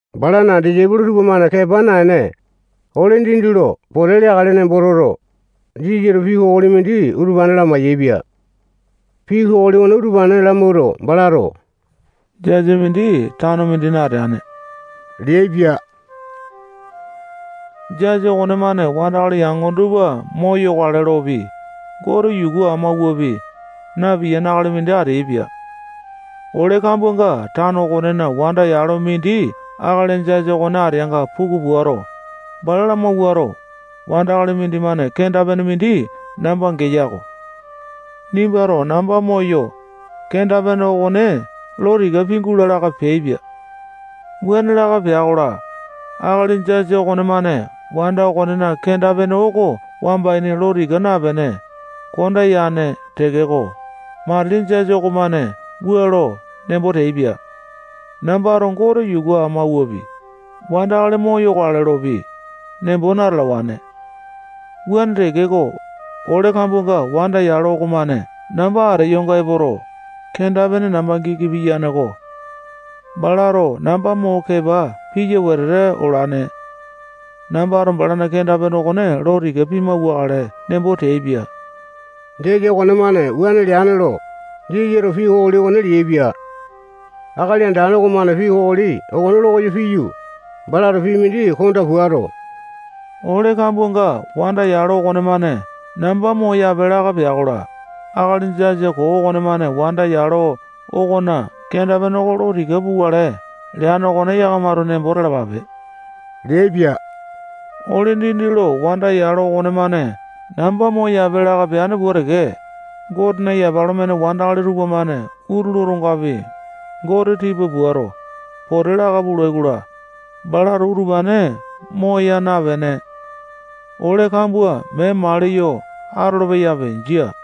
Balana disaipolo tupamane kepa naene, ole dindi lo pote leakale nembo toto, Jisasato pii kokoli mindi utupane lamai-yaepia. Pii kokoli okone utupane lamawuato, balato jasa mindi tano mindina ateane leaipia. Jasa okonemane wandakali yangone tupa moyokale lopi, Gote yuku amawuapi, napiyane akali mindi ateaipia. Ole kambuanga tano okonena wanda yalo mindi akali jasa okone ateanga puku puato, bala lamawuato, wandakali mindimane kenda-pene mindi namba geya-ko. Nimbato namba moyo, kenda-pene okone lo tika pingula laka peaipia. Wuane laka pea-kola, akali jasa okonemane wanda okonena kenda-pene oko wamba ini lo tika napene, konda yane tekeko, matili jasa okomane wua lo nembo teaipia: Nambato Gote yuku amawuapi, wandakali moyokale lopi, nembo natalawane. Wuane tekeko, ole kambuanga wanda yalo okomane namba ateyonga epoto, kenda-pene namba giki piyane-ko. Balato namba mo kepa piya wetete olane. Nambato balana kenda-pene okone lo tika pimauwakale nembo teaipia. Jasa okonemane wuane leane lo, Jisasato pii kokoli okone leaipia. Akali Andane okomane pii kokoli okone lo koyo piyu, balato pii mindi konda puato, ole kambuanga wanda yalo okonemane namba moyape laka pea-kola, akali jasa koo okonemane wanda yalo okona kenda-pene oko lo tika pukale leane okone yakamato nembo talapape leaipia. Ole dindi lo wanda yalo okonemane namba moyape laka peteane pua teke, Gotena yapa lo mene wandakali tupamane utulu otongapi, Gote tipa puato, pote laka pulai-kola, balato utupane moya napene, ole kambua mee maliyo atolo-peyape. Jia.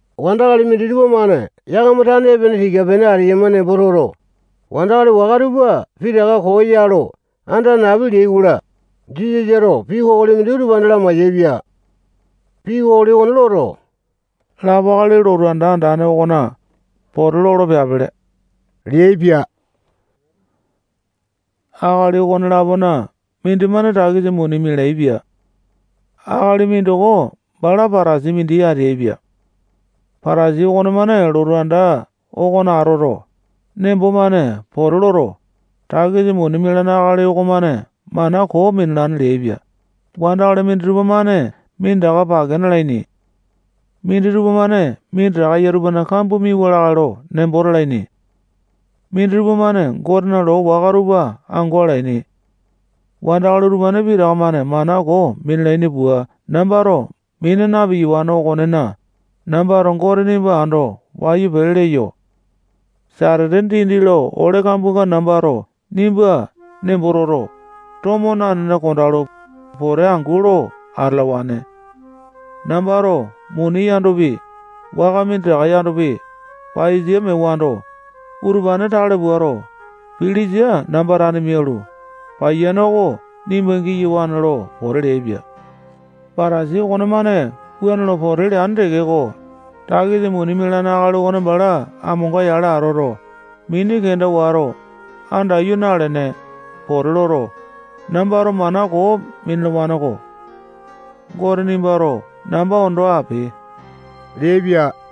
Wandakali minditupa-mane yakama tane epene tika-pene ateyama nembo toto, wandakali waka tupa pitaka koo ya lo anda napi leai-kola, Jisasato pii kokoli mindi utupane lamayaepia. Pii kokoli okone loto, lapo akali lotu anda andane okona pote lolo peapele leaipia. Akali okone-lapona mindimane takisa muni mialaepia. Akali mindoko bala Patasai mindi ateaipia. Patasai okonemane lotu anda okona atoto, nembo-mane pote loto, takisa muni mialane akali okomane mana koo minalane leaipia. Wandakali minditupa-mane minditaka pake nalaini. Minditupa-mane minditaka eya tupana kambua miauwa lakae lo nembo talaini. Minditupa-mane Gotena loo waka tupa ango alaini. Wandakali utupane pitaka-mane mana koo minalaini pua nambato mina na-piyawane okonena, nambato Gote nimba ando wayu pele leyo. Satete dindi lo ole kambuanga nambato nimba nembo toto, tomo nanene kondalu, pote angu lo atalawane. Nambato muni yandopi, waka minditaka yandopi, paiyasa mewando, utupane tale puato, pilisa namba tane mialu, paiyane oko nimba giyawane lo pote leaipia. Patasai okonemane wuane lo pote leane tekeko, takisa muni mialane akali okone bala aŋa amonga-yale atoto, mini kenda wato, andaiyu nalene, pote loto, nambato mana koo minalawane-ko. Gote nimbato namba ondo ape leaipia.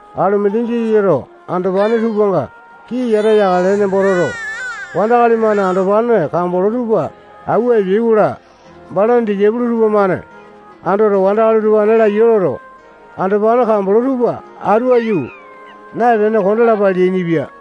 Alumindi Jisasato andopane tupanga kii yata yakale nembo toto, wandakali-mane andopane kambolo tupa awua epeai-kola, balana disaipolo tupamane andoto, wandakali utupane laiya loto, andopane kambolo tupa atu aiyu naepene, kondalapa leainipia.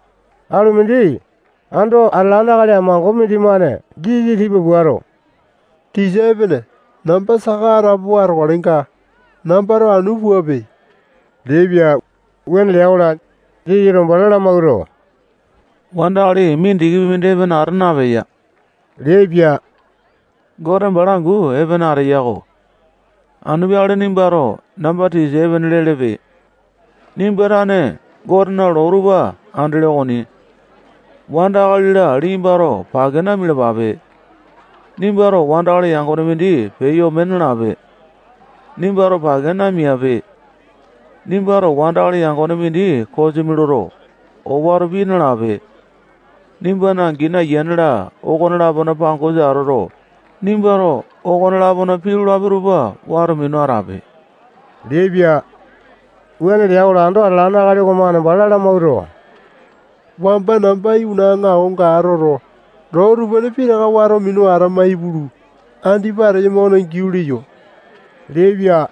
Alumindi ando atalane akali amango mindimane Jisasa tipa puato, tisa epene, namba saka atapowa atokalenga, nambato anu puape leaipia. Wuane lea-kola, Jisasato bala lamawuato, wandakali mindikipi mindi epene ata napeya leaipia. Gote bala angu epene ateya-ko. Anu peakale nimbato namba tisa epene lelepe. Nimba tane Gotena loo tupa andele okoni. Wanda akali-la liyambato pake namialapape. Nimbato wandakali yangone mindi peyo ome nalape. Nimbato pake mia napipe. Nimbato wandakali yangone mindi kosimi loto, owato pii nalape. Nimbana angini, ayiane-la okone-lapona pangosa atoto, nimbato okone-lapona pii lolapi tupa wato minu atape leaipia. Wuane lea-kola, ando atalane akali okomane bala lamawuato, wamba namba iwana aŋakonga atoto, loo utupane pitaka wato minu atama ipulu, andipa ateyama okona giau leyo leaipia.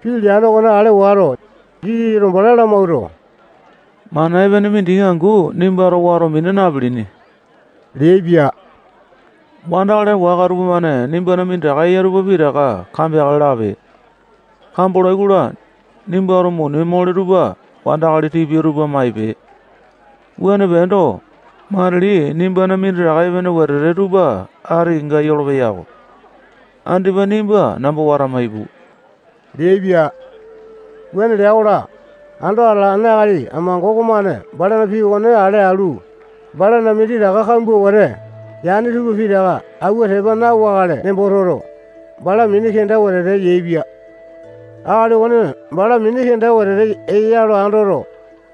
Pii leane okone ale wato, Jisasato bala lamawuato, mana epene mindiki angu nimbato wato mina napilini leaipia. Wandakali waka tupamane nimbana minditaka eya tupa pitaka kambeakale lape. Kambolai-kola, nimbato muni mole tupa wandakali tipia tupa maipe. Wuane peendo, matili nimbana minditaka epene wetete tupa ati kenga yola-ko. Andipa nimba namba watama ipu leaipia. Wuane lea-kola, ando atalane akali amango okomane balana pii okone ale alu, balana minditaka kambua wete yane tupa pitaka awua tepa na-wakale nembo toto, bala mini kenda wetete yaepia. Akali okone bala mini kenda wetete eya lo andoto,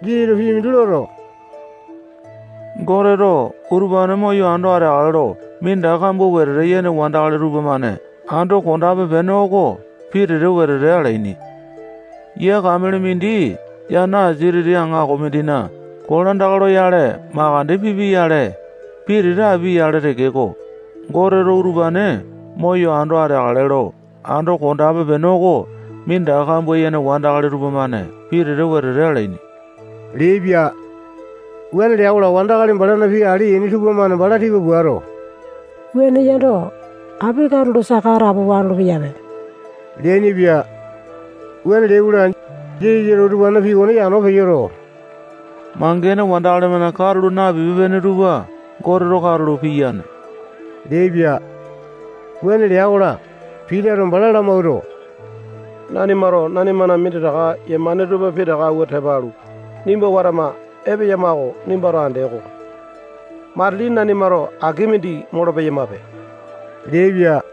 Jisasato pii mindi loto, Goteto utupane moyo ando ateakale lo minditaka kambua wetete yene wandakali tupamane ando kondape-pene oko pitete wetete alaini. Yia kamele mindi yana asia titi aŋako mindina kolandaka loyale makande pipia-yale, pitete apia-yale tekeko, Goteto utupane moyo ando ateakale lo ando kondape-pene oko minditaka kambua yene wandakali tupamane pitete wetete alaini leaipia. Wuane lea-kola, wandakali balana pii ale yaini tupamane bala tipa puato, wuane yando, api katulo saka atapowa atolo-peyape leainipia. Wuane leai-kola, Jisasato utupanena pii okone yano peyoto, mangene wandakali-mane katulo napipe-pene tupa Goteto katulo piyane leaipia. Wuane lea-kola, Pitato bala lamawuato, nanimato nanimana minditaka yemane tupa pitaka awua tepa alu, nimba watama epeyama oko nimbato andee-ko. Matili nanimato aki mindi molo-peyamape leaipia.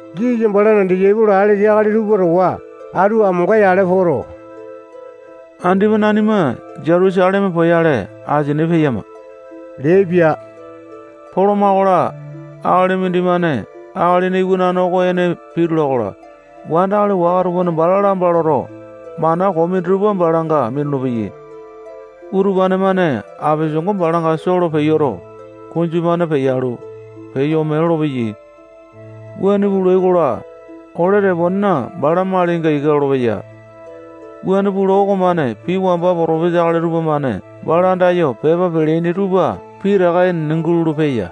Jisasa balana disaipolo alesa akali tupa towa atu amonga-yale poto, andipa nanima Jutusaleme poyale asini peyama leaipia. Poloma-kola, akali mindimane Akalina Iwanane oko ene pitula-kola, wandakali waka tupamane bala lamba loto, mana koo minditupa balanga minulu-peyai. Utupane-mane apesango balanga soo lo peyoto, kunju-mane peyalu, peyo ome lolopeyai. Wuane pulai-kola, ole teponena bala malinga ika lolopeya. Wuane pula okomane pii wamba potopesa akali tupamane bala andayo pepa peleaini tupa pitaka enene gulolo-peya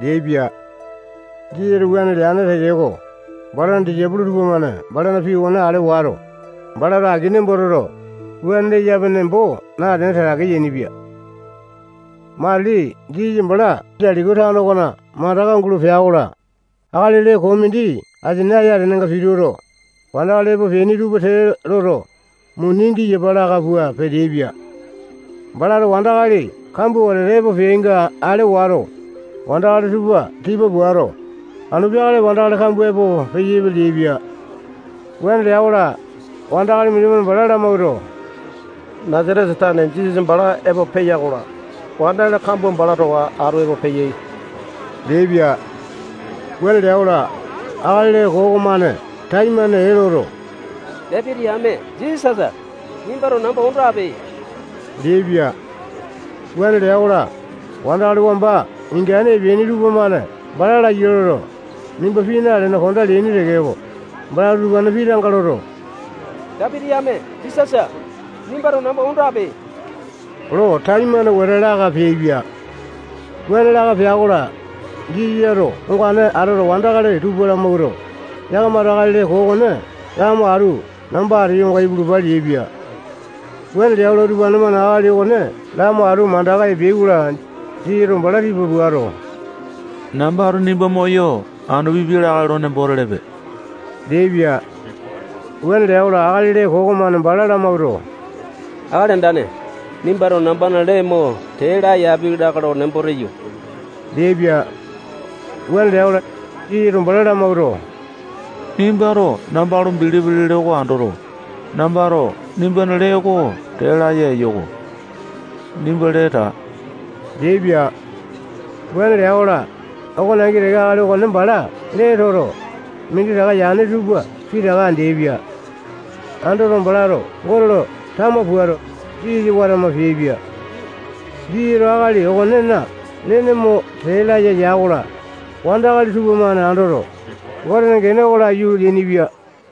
leaipia. Jisasato wuane leane tekeko, balana disaipolo tupamane balana pii okone ale wato, balato aki nembo toto, wuane leyape nembo natene, tatake yainipia. Matili Jisasa bala yuu Jetiko okona mandaka gulo pea-kola, akali lee koo mindi asia ayatenenga pituto, wandakali epo peaini tupa tee loto, muni giyapa laka pua peteaipia. Balato wandakali kambua wetete epo peainga ale wato, wandakali tupa tipa puato, anu peakale wandakali kambua epo peyaipe leaipia. Wuane lea-kola, wandakali mindimane bala lamawuato, Nasatesa tane Jisasa bala epo peya-kola, wandakali kambua bala towa atu epo peyai leaipia. Wuane lea-kola, akali lee koo okomane taimane ee loto, Dapiti yame Jisasa, nimbato namba ondo ape leaipia. Wuane lea-kola, wandakali wamba ingane epeaini tupamane bala laiya loto, nimba pii nalene kondaa leaini tekeko, balato utupanena pii tanga loto, Dapiti yame Jisasa, nimbato namba ondo ape lo taimane wete laka peaipia. Wuane laka pea-kola, Jisasato ongane atoto, wandakali tupa lamawuato, yakamato akali lee koo okone lamo atu namba ateyonga ipulupa leaipia. Wuane lea-kola, utupane-mane akali okone lamo atu mandaka epeai-kola, Jisasato bala tipa puato, nambato nimba moyo anu pipi lakae lo nembo telepe leaipia. Wuane lea-kola, akali lee koo okomane bala lamawuato, Akali Andane, nimbato nambana lee mo tee laya api lakae lo nembo teyo leaipia. Wuane lea-kola, Jisasato bala lamawuato, nimbato namba lo bilipi lele oko andoto, nambato nimbana lee oko tee laya eyo-ko. Nimba lee taa leaipia. Wuane lea-kola, okone angi teke akali okone bala lee toto, minditaka yane tupa pitaka andeaipia. Andoto, balato Gote lo tama puato, Jisasa watama peaipia. Jisasato akali okonena lene mo tee laya ya-kola, wandakali tupamane andoto, Gotena gene oko laiyu leainipia.